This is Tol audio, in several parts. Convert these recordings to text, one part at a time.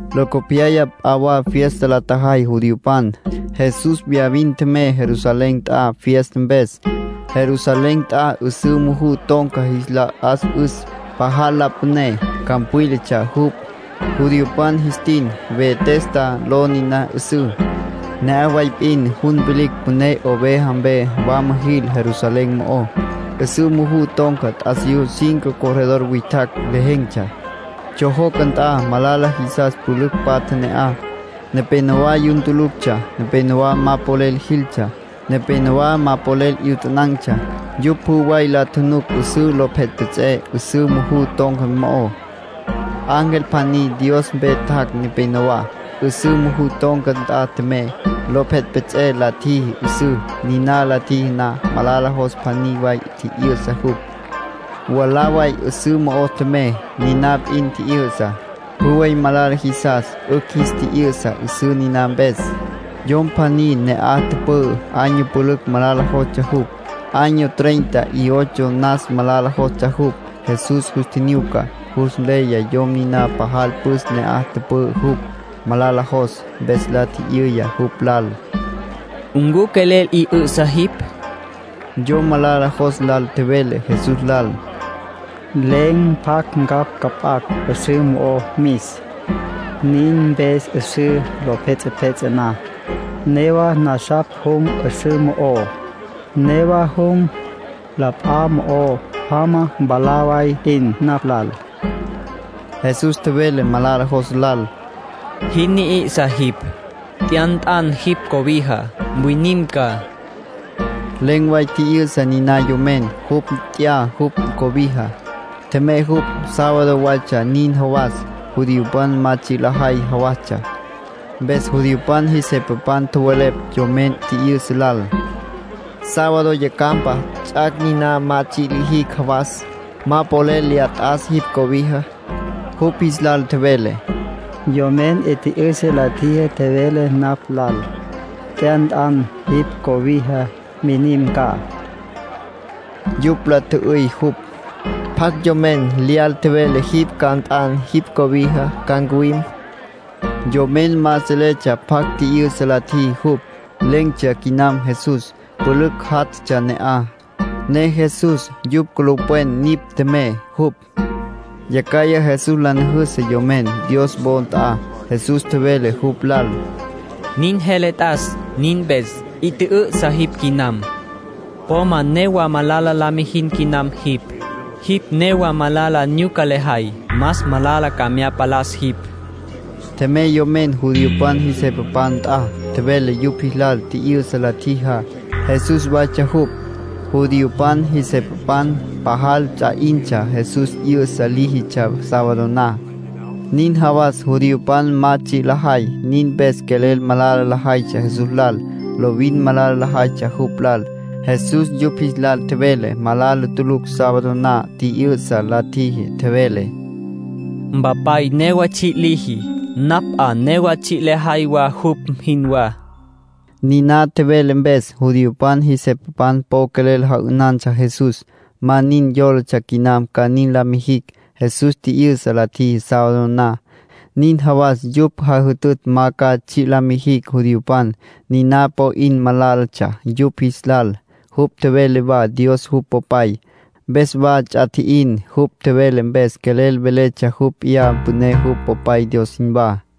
Locopyaya p'a wa fiesta la tjajay judiopan. Jesús viyavin tjemey Jerusalén nt'a fiesta mpes. Jerusalén nt'a 'üsǘ muju ton̈ca jis la 'as'üs. Pajal la püné, campwílatsja jupj. Judiopan jis tin “Betesda” ló niná 'üsǘ. Ne'aj way p'in jun vilicj püné oveja mpe wama jil Jerusalén mo'ó. 'Üsǘ muju ton̈ca t'asiyú cinco corredor witjacj lejen̈tsja. Tsjojoca nt'a malala jisas pülücj tapatja ne'aj. Nepénowa yun tuluctsja, nepénowa ma polel jiltsja, nepénowa ma polel 'yutanan̈tsja. Yupj pjü way la tjunuc 'üsǘ lo pjets'epjets'e 'üsǘ muju ton̈ca mo'ó. Ángel pjaní Dios mpe tjac' neneyawá, 'üsǘ muju ton̈ca nt'a tjemey, lo pjets'epjets'e la tjiji 'üsüs. Niná la tjiji na, malala jos pjaní way tji'yü'sa jupj. Mwalá way 'üsǘ mo'o tjemey, niná p'in tji'yü'sa. Pjü way malala jisas 'ücj jis tji'yü'sa 'üsǘ niná mpes. Yom pjaní ne'aj tüpü'ü, año pülücj malala jostsja jupj. Año treinta y ocho nas malala jostsja jupj. Jesús jus tjinyuca, jus nleya yom niná pajal püs ne'aj tüpü'ü jupj, malala jos. Mpes la tji'yüya jupj lal: —¿Ncu quelel 'i 'ü'sa jipj? Yom malala jos lal tjevele Jesús lal: —Len̈ pjacj ncapj cüp'acj 'üsǘ mo'o mis. Nin mpes 'üsǘ lo pjets'epjets'e na, newa nasapj jum 'üsüs mo'ó. Newa jum, p'a wa mo'o jama mwalá way p'in napj lal. Jesús tjevele malala jos lal: —¡Jin ni'isa jipj! Nt'ya nt'an jipj cobija. Mwinim ca. Len̈ way tji'yü'sa niná yomen. Jupj nt'ya jupj cobija, tjemey jupj. Sábado waytsja nin jawas, judiopan ma tsji' lajay jawastsja. Mpes judiopan jis jepapan tjowelepj yomen tji'yü'sa lal: —Sábado yacjampa, ts'ac' niná ma tsji' lijicj jawas. Ma polel lya t'as jipj cobija. Jupj jis lal tjevele: —Yomen ntji'ü'sa la tjiji tjevele napj lal: ‘Nt'ya nt'an jipj cobija. Mwinim ca.’ Yupj la tjü'üy jupj: —¿Pjacj yomen lyal tjevele jipj ca nt'an jipj cobija, ca mwinim? Yomen ma seletsja pjacj tji'yü'sa la tjiji jupj. Len̈tsja quinam Jesús. Pülücj játjatsja ne'aj, ne Jesús yupj culupwen nipj tjemey jupj. Yacjaya Jesús la nüjüsü yomen Dios wo nt'a. Jesús tjevele jupj lal: —Nin jele t'as nin mpes: 'i tjü'ü'sa jipj quinam. Po ma newa malala la mijin quinam jipj. Jipj newa malala nyuca lejay, más malala ca mya palas jipj. Tjemey yomen judiopan jis jepapan nt'a. Tjevele yupj jis lal tji'yü'sa la tjijá, Jesús waytsja jupj. Judiopan jis jepapan pajal ts'a 'intsja Jesús 'yü'sa líjitsja sábado na, nin jawas judiopan ma tsji' lajay. Nin mpes quelel malala lajaytsja Jesús lal. Lovin malala lajaytsja jupj lal. Jesús yupj jis lal tjevele malala tulucj sábado na tji'yü'sa la tjiji. Tjevele: —Mpapay newa tsji' liji. Napj 'a newa tsji' lejay wa jupj jinwá. Niná tjevele mpes, judiopan jis jepapan po quelel ja'ünantsja Jesús. Más nin yólatsja quinam ca nin la mijicj. Jesús tji'yü'sa la tjiji sábado na, nin jawas yupj jajütütj ma ca tsji' la mijicj judiopan. Niná po 'in malálatsja yupj jis lal. Jupj tjevele wa Dios jupj Popay, mpes wa ts'a tji'in. Jupj tjevele mpes quelel véletsja jupj p'iyá püné jupj Popay Dios jinwá.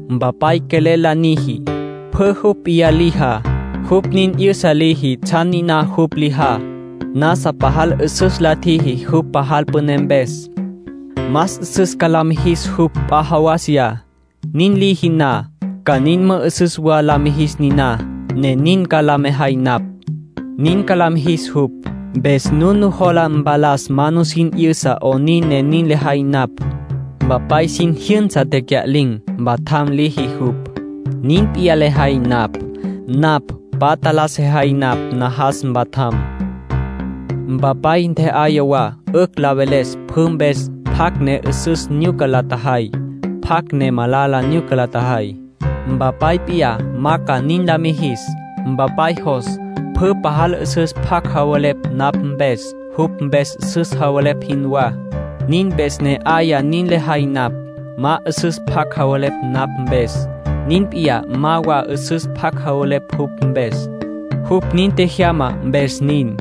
Mpapay quelel la niji. Pjü jupj p'iyá lijá, jupj nin 'yüsa liji tsjan niná jupj lijá. Nasa pajal 'üsüs la tjiji jupj pajal püné mpes. Más 'üsüs ca la mijis jupj p'a jawasiyá. Nin liji na, ca nin mü'üsüs wa la mijis niná, ne nin ca la mejay napj. Nin ca la mijis jupj, mpes nun nujola mpalas ma nusin 'yüsa 'onin ne nin lejay napj. Mpapay sin jyünsa tecya'lin̈, mpatjam liji jupj. Nin p'iyá lejay napj; napj patja la sejay napj najas mpatjam. Mpapay ntje'aya wa 'ücj la veles pjü mpes pjacj ne 'üsüs nyuca la tjajay, pjacj ne malala nyuca la tjajay. Mpapay p'iyá ma ca nin la mijis. Mpapay jos pjü pajal 'üsüs pjac javelepj napj mpes, jupj mpes 'üsüs javelepj jinwá. Nin mpes ne 'aya nin lejay napj. Ma 'üsüs pjac javelepj napj mpes, nin p'iyá ma wa 'üsüs pjac javelepj jupj mpes. Jupj nin tjejyama, mpes nin.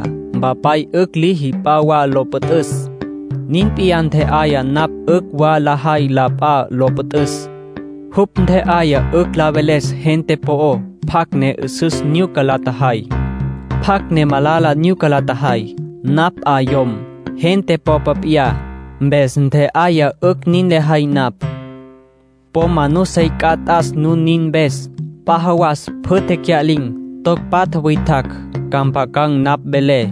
”Mpapay 'ücj liji p'a wa lo püt'üs. Nin p'iyá ntje'aya napj 'ücj wa lejay la p'a lo püt'üs. Jupj ntje'aya 'ücj la veles gente po'ó pjacj ne 'üsüs nyuca la tjajay, pjacj ne malala nyuca la tjajay. Napj 'a yom, gente popa p'iyá, mpes ntje'aya 'ücj nin lejay napj. Po ma nusey c'a t'as nun nin mpes. P'a jawas pjü tecya'lin̈, toc patja witjacj, ca mpjacan̈ napj velé.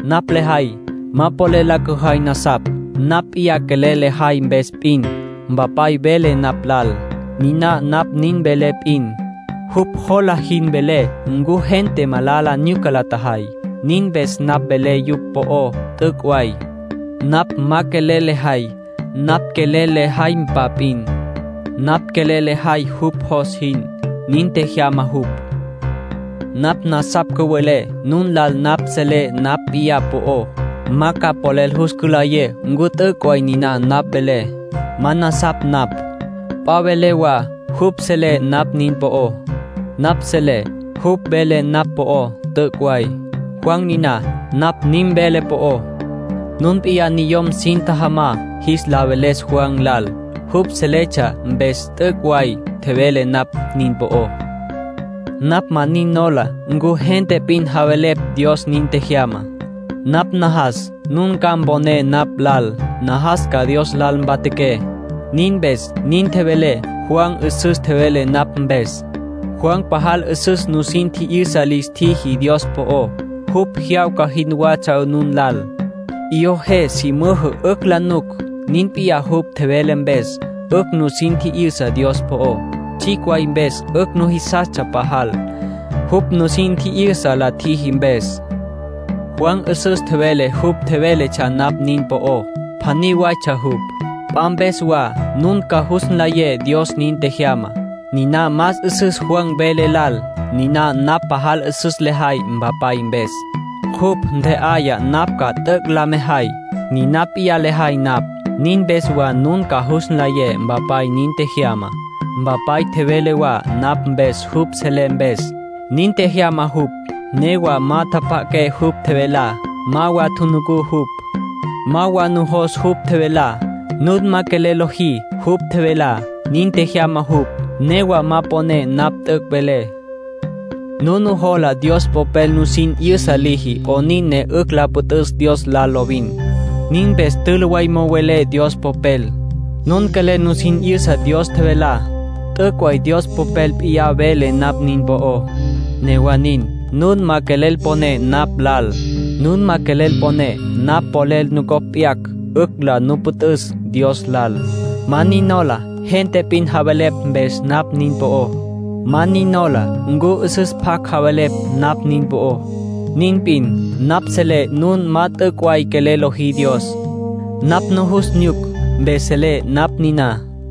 ”Napj lejay, ma polel la cüjay nasapj, napj p'iyá quelel lejay mpes p'in. Mpapay vele napj lal, niná napj nin velé p'in. Jupj jola jin velé ncu gente malala nyuca la tjajay. Nin mpes napj velé yupj po'ó t'üc' way. Napj ma quelel lejay napj quelel le jaympa p'in. Napj quelel lejay jupj jos jin. Nin tjejyama jupj. Napj nasapj cüwelé nun lal napj selé napj p'iyá po'ó, ma ca polel jus cülayé ncu t'üc' way niná napj velé. Ma nasapj napj. P'a vele wa jupj selé napj nin po'ó. Napj selé jupj vele napj po'ó, t'üc' way. ”Juan niná napj nin velé po'ó. Nun p'iyá niyom sin tjajamá jis la veles Juan lal. Jupj seletsja mpes t'üc' way tjevele napj nin po'ó. Napj ma nin nola ncu gente p'in javelepj Dios nin tjejyama. Napj najas nun ca mponé napj lal. Najas ca Dios lal mpatjaqué. Nin mpes nin tjevelé Juan 'üsüs tjevele napj mpes. Juan pajal 'üsüs nusin tji'yüsa lis tjiji Dios po'ó. Jupj jyawca jinwatsja nun lal. 'Iyó je su müjǘ 'ücj la nuc. Nin p'iyá jupj tjevele mpes 'ücj nusin tji'yüsa Dios po'ó. Tsjicj way mpes 'ücj nujisastsja pajal, jupj nusin tji'yüsa la tjiji mpes. ”Juan 'üsüs tjevele jupj seletsja napj nin po'ó. Pjaní waytsja jupj. P'a mpes wa nun ca jus nlayé Dios nin tjejyama. Niná más 'üsüs Juan vele lal. Niná napj pajal 'üsüs lejay Mpapay mpes. Jupj ntje'aya napj ca t'üc' la mejay, niná p'iyá lejay napj. Nin mpes wa nun ca jus nlayé Mpapay nin tjejyama. ”Mpapay tjevele wa napj mpes jupj selé mpes. Nin tjejyama jupj. Newa ma tjapja'aqué jupj tjevelá. Ma wa tjunucú jupj. Ma wa nujos jupj tjevelá. Nun ma quelel lojí jupj tjevelá. Nin tjejyama jupj, newa ma poné napj t'üc' velé. Nun nujola Dios Popel nusin 'yüsa liji 'onin ne 'ücj la püt'üs Dios lal lovin. Nin mpes tülü way mo'o welé Dios Popel. Nun quelel nusin 'yüsa Dios tjevelá. T'üc' way Dios Popel p'iyá vele napj nin po'ó. Newa nin, nun ma quelel poné napj lal. Nun ma quelel poné napj polel nucopj p'yacj, 'ücj nu la püt'üs Dios lal. ”Ma nin nola gente p'in javelepj mpes napj nin po'ó. Ma nin nola ncu 'üsüs pjac javelepj napj nin po'ó. Nin p'in, napj selé nun ma t'üc' way quelel lojí Dios. Napj nujus nyuc, mpes selé napj niná.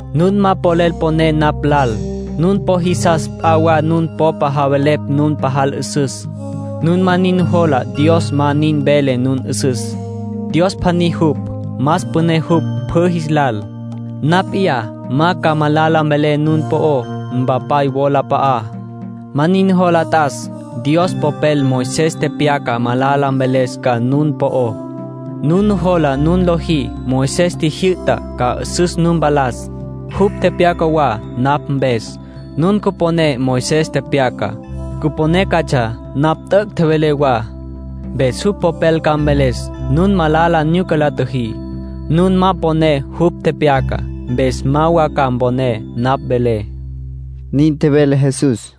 ”Nun ma polel poné napj lal. Nun po jisas p'a wa nun popa javelepj nun pajal 'üsüs. Nun ma nin nujola Dios ma nin vele nun 'üsüs. Dios pjaní jupj, más püné jupj pjü jis lal. Napj p'iyá ma ca malala mvelé nun po'ó Mpapay wolap'a'á. Ma nin nujola t'as. Dios Popel Moisés tepyacá malala mveles ca nun po'ó. Nun nujola nun lojí Moisés tjijyü'tá, ca 'üsüs nu mpalas. Jupj tepyaca wa napj mpes. Nun cüponé Moisés tepyacá, cüponé catsja napj t'üc' tjevelé wa. Mpes jupj popel ca mveles nun malala nyuca la tjüjí. Nun ma poné jupj tepyacá, mpes ma wa ca mponé napj velé”, nin tjevele Jesús.